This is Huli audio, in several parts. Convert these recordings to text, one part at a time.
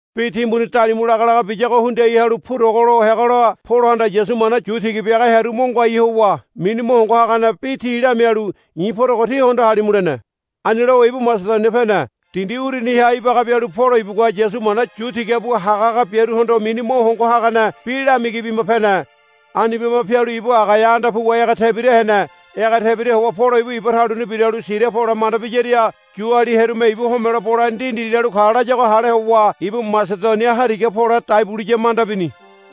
Bi timbuni dalimu lagalaga biyago hundiai halu purogolo heagola Polohanda Yasu mana yu tiga biaga hearu mo ngoai howa mini mo hongo hagane bi ti lamialu, I̱ porogo tí hondo halimu, lene. Ani lowa ibu Masedonia pene. Dindi uruniha ibaga bialu Polo ibugua Yasu mana yu tiga bu hagahaga biaruhondo mini mo hongo hagane bi lamigi bima pene. Ani bima pialu ibu Agaia anda puwa ege tebira hene. Ege tebira howa Polo ibu iba taluni biralu Siria pole manda biyaria Yuali hearume ibu homelo bole ndindi lalu ka layago hale howa ibu Masedonia hariga pole dai buliya manda bini.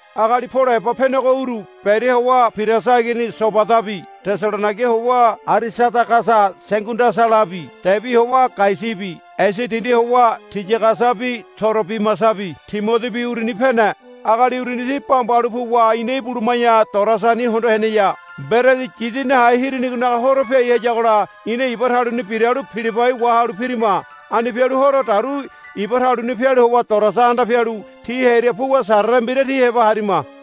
Agali Polo heba penego uru Beria howa Pirasa igini Sobadabi Tesalonaiga howa Arisadagasa Segundasalabi Debi howa Gaiasabi Esia dindi howa Tiyagasabi Torobimasabi Timodibi uruni pene. Agali uruni ti bamba halu puwa ina ibuluma̱ya Toroasani hondo heneya. Mberedi Yidi Nahe Hirinigonaga Horo piai hayagola ina iba taluni biralu Pilibai wahalu pirima. Ani pialu horo dauru iba taluni pialu howa Toroasa anda pialu ti hearia puwa sarere mbira ti heba harima.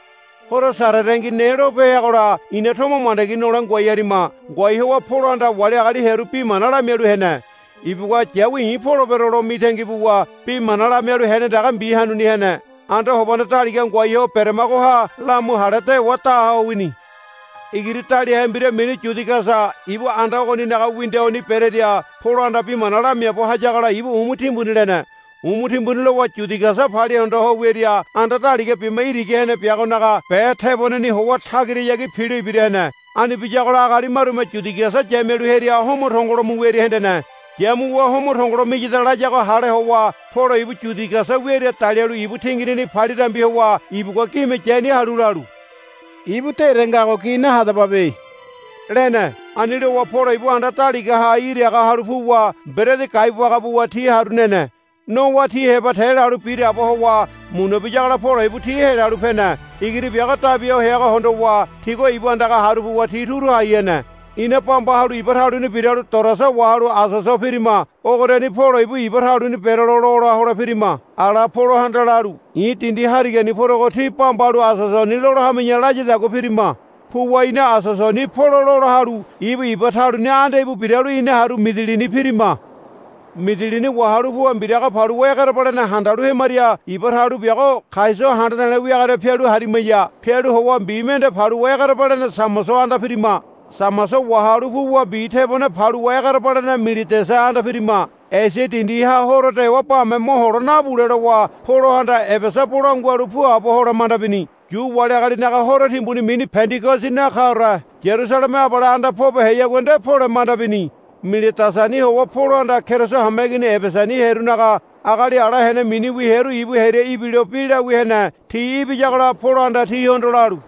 Horo Sarerengi ne lope heagola ina tomo mandagi nole ngoai harima. Ngoai howa Polohanda wali agali hearu bi mana lamialu hene. Ibugua, Yawi i̱ polebero, lo mitangi buwa bi mana lamialu heane dege mbi hanuni hene. Anda hobane daliga ngoai ho beremagoha lamu hale dewa da ho wini. Igiri daliahe mbira mini Yudigasa ibu anda ogoninaga windoni berearia Polohanda bi mana lamiaabo hayagola ibu umu timbuni lene. Umu timbuni lowa Yudigasa palia hondo ho wiaria anda daliga bima irigi hene biagonaga be teboneni howa tagirahayagi pilo ibira hene. Ani biyagola agali marume Yudigasa yamialu hearia homo tongolo mu wiaria hendene. Yamuwa homo tongolo miyada layago hale howa Polo ibu Yudigasa wiaria dalialu ibu tinginini palia dambi howa ibugua gime yania halu lalu, Ibu dére ngago gi nahadababe, lene. Ani lowa Polo ibu anda daligaha iraga halu puwa mberedi gaibu baga buwa ti haru nene. Nowa ti heba te lalu biraabo howa muna biyagola Polo ibu ti helalu pene. Igiri biago dabi ho heago hondowa tigua ibu andaga haru puwa ti turu hai hene. Ina bamba halu iba taluni biralu Toroasa wahalu Asoso pirima. Ogoriani Polo ibu iba taluni berelo lola hole pirima. Ala Polohanda lalu, I̱ dindi harigani porogo tí bamba halu Asosoni lola hami̱ya, layadagua pirima. Puwa ina Asosoni Polo lola halu ibu iba taluni anda íbu biralu ina haru Midilini pirima. Midilini wahalu puwa mbiraga paluwa egerebalene handalu hemaria iba talu biago Kaioso handa de̱le̱ wiagoria pialu harimaya. Pialu howa mbi mende paluwa egerebalene Samoso anda pirima. Samoso wahalu puwa mbi tebone paluwa egerebalene Miledasa anda pirima. Esia dindiha horo dewa bame mohole nabule lowa Polohanda Ebesa bolangua halu puabo hole manda bini. Yu wali agalinaga horo timbuni mini Pendigosi nakaore Yarusaleme abale anda pobeheyagua nde pole manda bini. Miledasani howa Polohanda Keriso hameigini Ebesani hearunaga agali ala hene miniwi hearu ibu hearia ibilo bi lawia hene. Ti ibiyagola Polohanda tihondo lalu,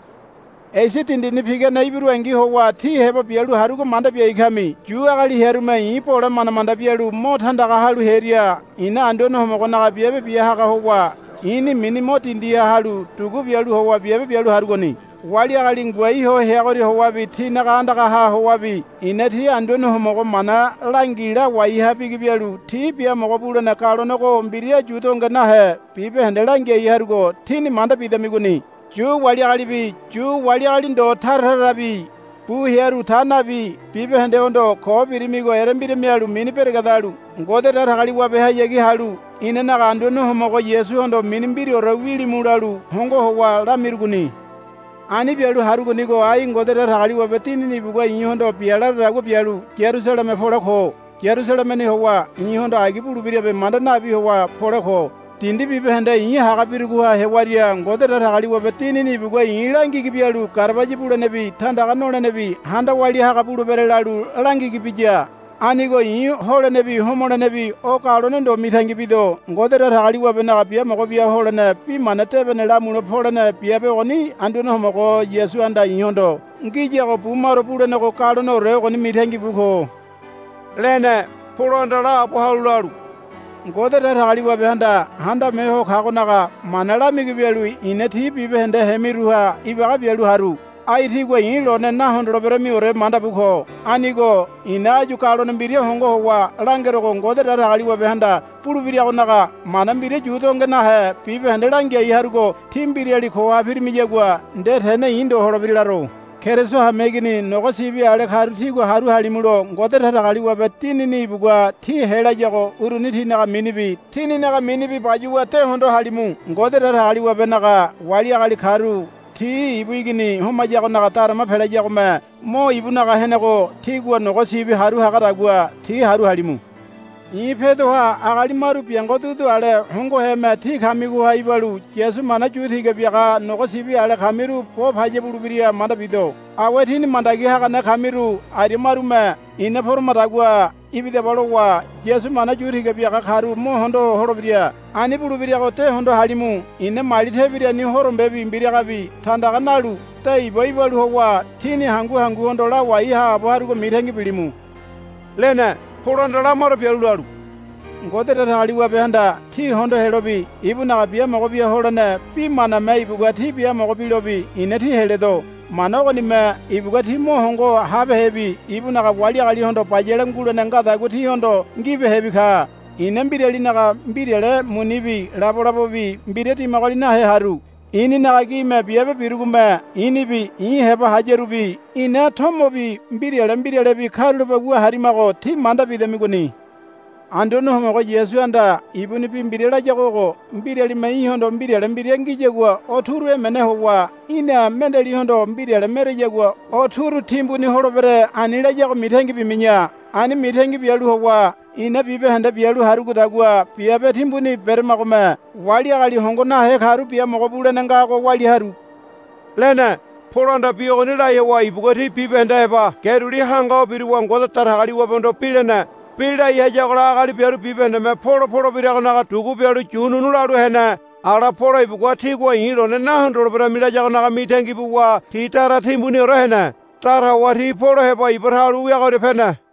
Esia dindini pigane ibirungi howa tí heba bialu harugo manda biai kami. Yu agali hearume i̱ bole manda manda bialu mo tandaga halu hearia i̱na Anduane Homogonaga biabe bia haga howa i̱ni mini mo dindiha halu dugu bialu howa biabe bialu harugoni. Wali agali ngoai ho heagoria howabi tínaga andagaha howabi i̱na tí Anduane Homogo mana langi lawai ha bigi bialu tí biamogo bulene galonego mbira yu donge nahe bibahende langiai harugo tíni manda bidamigoni. Yu wali agalibi Yu wali agali ndo tara tarabi bu hearu ta nabi bibahendehondo, Ko birimigo erembira mialu mini beregedalu Ngode Datagaliwabehayagi halu inanaga Anduane Homogo Yasuhondo mini mbiraore wilimu, lalu hongo howa lamirugoni. Ani bialu harugonigo ai Ngode Datagaliwabe Dinini ibugua i̱hondo bia laradagua bialu Yarusaleme pole ko. Yarusalemeni howa i̱hondo agi bulebirabe manda nabi howa pole ko. Dindi bibahende i̱ haga birugoha hewaria Ngode Datagaliwabe Dinini ibugua i̱ langigi bialu, Garabaya bulenebi tandaga nolenebi handa walia haga bulebere, lalu langigi biya. Anigo i̱ holenebi homolenebi o galone ndo mitangi bido. Ngode Datagaliwabenaga biamogo bia holene Bi Mana Debene lamule polene biabe ogoni Anduane Homogo Yasuhanda i̱hondo ngiyago bu maro bulenego galoneore ogoni mitangi bu ko, lene. Polohanda laabo halu lalu, Ngode Datagaliwabehanda Handame Ho Kagonaga mana lamigi bialu i̱na tí bibahende hemiruha ibaga bialu haru. Ai tígua i̱ lone nahondoleberamiore manda bu ko. Anigo i̱na áyu galone mbira hongo howa langerogo Ngode Datagaliwabehanda bulebiragonaga mana mbira yu donge nahe bibahende langiai harugo tí mbirali koha pirimiyagua nde tene i̱ ndo holebira laro. Keriso hameigini nogo sibi ale karu tígua haru halimulo Ngode Datagaliwabe Dinini ibugua tí helayago uruni tinaga minibi tíninaga minibi bayuwa de hondo halimu. Ngode Datagaliwabenaga wali agali karu ti ibu igini homayagonaga darama pelayagome mo ibunaga henego tígua nogo sibi haru hagadagua ti haru halimu. I̱ pedoha agali maru biango dudu ale hongoheme tí kamigoha ibalu Yasu mana yu tiga biaga nogo sibi ale kamiru bo paya bulebira manda bido. Awe tíni mandagi hagane kamiru aria marume, Ina poramadagua ibidaba, lowa Yasu mana yu tiga biaga karu mo hondo holebira. Ani bulebirago de hondo halimu. I̱na mali tebiruni horombebi mbiragabi tandaga nalu de iba ibalu howa tíni hangu hanguhondo lawai haabo harugo mitangi bilimu, lene. Polohanda lamaro bialu lalu, Ngode Datagaliwabehanda tí hondo helobi ibunaga biamogo bia holene bi maname ibugua tí biamogo bilobi i̱na tí heledo. Mana ogonime ibugua tí mo hongo habehebi ibunaga wali agalihondo bayale ngulene ngadagua tíhondo ngibehebi ka. I̱na mbiralinaga mbirale munibi labolabobi mbira dimagoli nahe haru. I̱ninaga gime biabe birugome i̱nibi i̱ heba hayarubi ina tomobi mbirale mbiralebi karulape wu harimago tí manda bidamigoni. Anduane Homogo Yasuhanda ibuni bi mbira layago ogo, Mbiralime í̠hondo mbirale mbira ngiyagua o turu emene howa í̠na mendealihondo mbirale mereyagua o turu timbuni holebere, ani layago mitangi bimi̱ya. Ani mitangi bialu howa i̱na bibahende bialu harugodagua biabe timbuni beramagome wali agali hongo nahe karu biamogo bulene ngago walia haru, lene. Polohanda bi ogoni lai howa ibugua ti bibahende heba ge duli hanga ho biruwa Ngode Datagaliwabehondo bi lene. Bi lai hayagola agali biaru bibahendeme Polo polebiragonaga dugu bialu yu nu̱nu̱ lalu hene. Ala Polo ibugua, Tígua i̱ lone nahondoleberami, layagonaga mitangi buwa ti dara timbuniore hene. Dara howa ti Polo heba iba talu wiagoria pene.